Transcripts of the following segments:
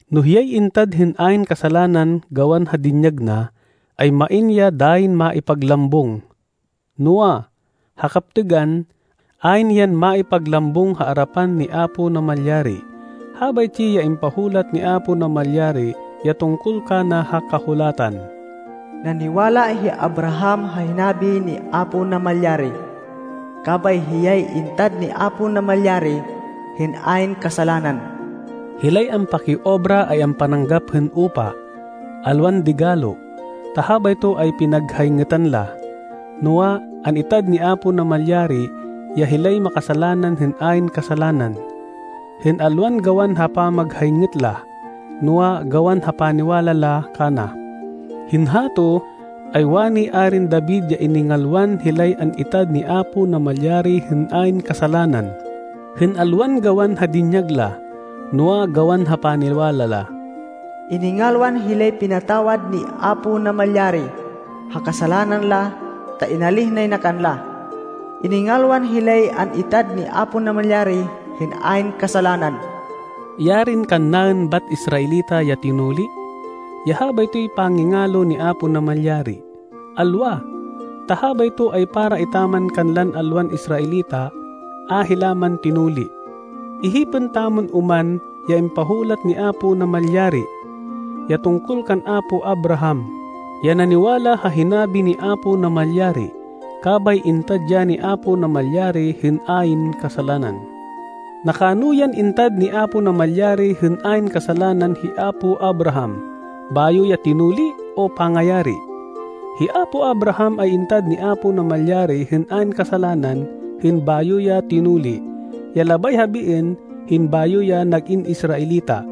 No hiyay intad hên ayn kasalanan gawan ha dinyag na, ay main ya dayin maipaglambung. Noa, ha kaptêgan, ayn yan maipaglambung ha arapan ni Apo Namalyari. Habaytsi ya impahulat ni Apo Namalyari ya tungkol kana ha Kahulatan, “Naniwala hi Abraham ha hinabi ni Apo Namalyari, kabay hiyay intad ni Apo Namalyari hên ayn kasalanan.” Hilay ampakiobra ay ampananggap hên upa, alwan digalo, ta habayto ay pinaghayngêtan la. Noa, an-itad ni Apo Namalyari ya hilay makasalanan hên ayn kasalanan, hên alwan gawan ha pamaghayngêt la, noa, gawan ha paniwala la kana. Hên hato, ay wani Arin David ya iningalwan hilay an-itad ni Apo Namalyari hên ayn kasalanan, hên alwan gawan ha dinyag la, noa, gawan ha paniwala la. “Iningalwan hilay pinatawad ni Apo Namalyari ha kasalanan la, ta inalíh nay na kanla. Iningalwan hilay an-itad ni Apo Namalyari hên ayn kasalanan.” Yarin kannaên bat Israelita ya tinuli, ya habaytoy pangingalo ni Apo Namalyari! Alwa! Ta habayto ay para etaman kanlan alwan Israelita a hila man tinuli. Ihipên tamon oman ya impahulat ni Apo Namalyari, ya tungkol kan apo Abraham, ya naniwala ha hinabi ni Apo Namalyari, kabay intad ya ni Apo Namalyari hên ayn kasalanan. Nakano yan intad ni Apo Namalyari hên ayn kasalanan hi apo Abraham, bayo ya tinuli, o pangayari? Hi apo Abraham ay intad ni Apo Namalyari hên ayn kasalanan hên bayo ya tinuli, ya labay habiên hên bayo ya nag-in Israelita.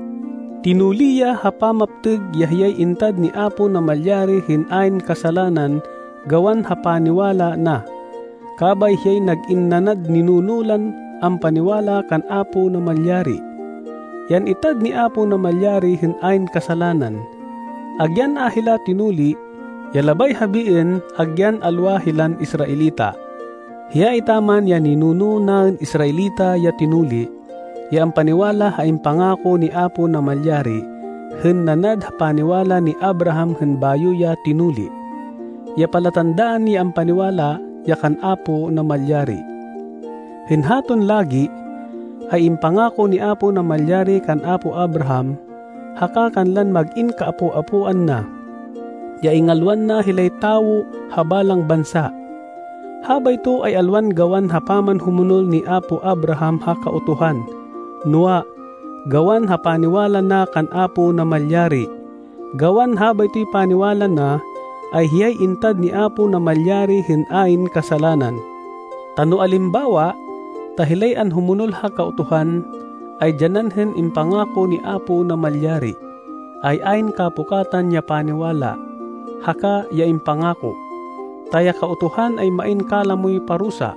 Tinuli ya ha pamaptêg ya hiyay intad ni Apo Namalyari hên ayn kasalanan gawan ha paniwala na. Kabay hiyay nag-in nanad ninuno lan ampaniwala kan Apo Namalyari, ya an-itad ni Apo Namalyari hên ayn kasalanan, agyan a hila tinuli, ya labay habiên agyan alwa hilan Israelita. Hiya etaman ya ninuno naên Israelita ya tinuli, ya ampaniwala ha impangako ni Apo Namalyari hên nanad ha paniwala ni Abraham hên bayo ya tinuli, ya palatandaan ya ampaniwala ya kan Apo Namalyari. Hên haton lagi, ay impangako ni Apo Namalyari kan apo Abraham haka kanlan mag-in kaapo-apoan na, ya ingalwan na hilay tawo ha balang bansa. Habayto ay alwan gawan ha pamanhumonol ni apo Abraham ha Kautuhan, noa, gawan ha paniwala na kan Apo Namalyari. Gawan habaytoy paniwala na, ay hiyay intad ni Apo Namalyari hên ayn kasalanan. Ta no alimbawa, ta hilay anhumonol ha Kautuhan, ay dyanan hên impangako ni Apo Namalyari, ay ayn kapukatan ya paniwala, haka ya impangako. Ta ya Kautuhan ay main kalamoy parusa.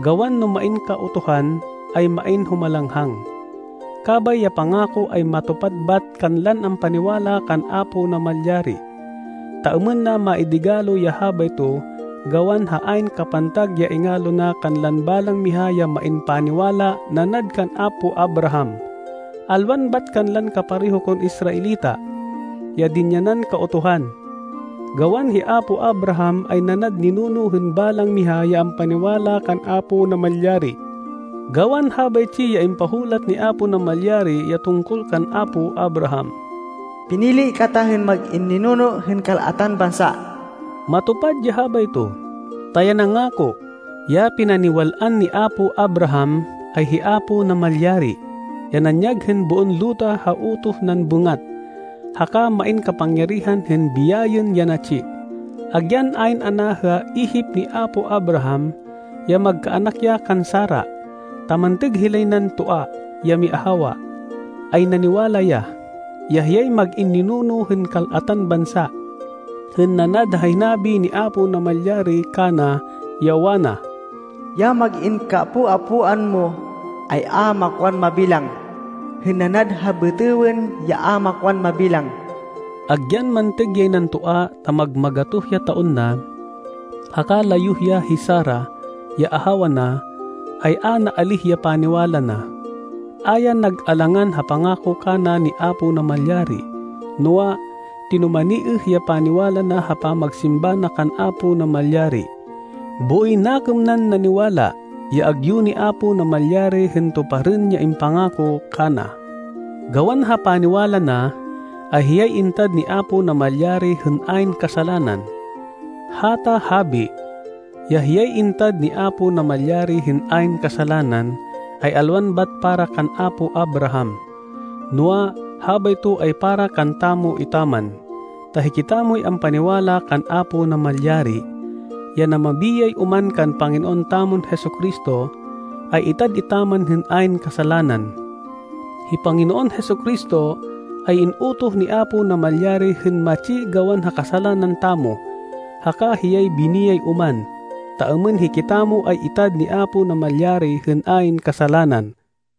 Gawan no main Kautuhan, ay main humalanghang. Kabay ya pangako ay matupad bat kanlan ampaniwala kan Apo Namalyari, ta êmên na maidigalo ya habayto gawan ha ayn kapantag ya ingalo na kanlan balang miha ya main paniwala nanad kan apo Abraham, alwan bat kanlan kapareho kon Israelita, ya dinyanan Kautuhan. Gawan hi apo Abraham ay nanad ninuno hên balang miha ya ampaniwala kan Apo Namalyari. Gawan habaytsi ya impahulat ni Apo Namalyari ya tungkol kan apo Abraham, “Pinili kata hên mag-in ninuno hên kal-atan bansa.” Matupad ya habayto, ta ya nangako, ya pinaniwal-an ni apo Abraham, ay hi Apo Namalyari, ya nanyag hên boon luta ha utoh nan bêngat, haka main kapangyarihan hên biyayên ya natsi. Agyan ayn ana ha ihip ni apo Abraham, ya magkaanak ya kan Sara, ta mantêg hilay nan toa ya miahawa, ay naniwala ya, ya hiyay mag-in ninuno hên kal-atan bansa, hên nanad ha hinabi ni Apo Namalyari kana, ya wana, “Ya mag-in kaapo-apoan mo ay a makwan mabilang, hên nanad ha bêtêwên ya a makwan mabilang.” Agyan mantêg yay nan toa ta mag-magatoh ya taon na, haka layuh ya hi Sara, ya ahawa na, ay a naalíh ya paniwala na. A ya nag-alangan ha pangako kana ni Apo Namalyari, noa, tinumaniêh ya paniwala na ha pamagsimba na kan Apo Namalyari. Booy nakêm nan naniwala, ya agyu ni Apo Namalyari hên tuparên ya impangako kana. Gawan ha paniwala na, ay hiyay intad ni Apo Namalyari hên ayn kasalanan. Hata habi, ya “Hiyay intad ni Apo Namalyari hên ayn kasalanan,” ay alwan bat para kan apo Abraham, noa, habayto ay para kantamo etaman. Ta hikitamoy ampaniwala kan Apo Namalyari, ya namabiyay oman kan Panginoon tamon Jesu-Cristo, ay itad etaman hên ayn kasalanan. Hi Panginoon Jesu-Cristo ay in-utoh ni Apo Namalyari hên matsi gawan ha kasalanan tamo, haka hiyay biniyay oman, ta êmên hikitamo ay itad ni Apo Namalyari hên ayn kasalanan.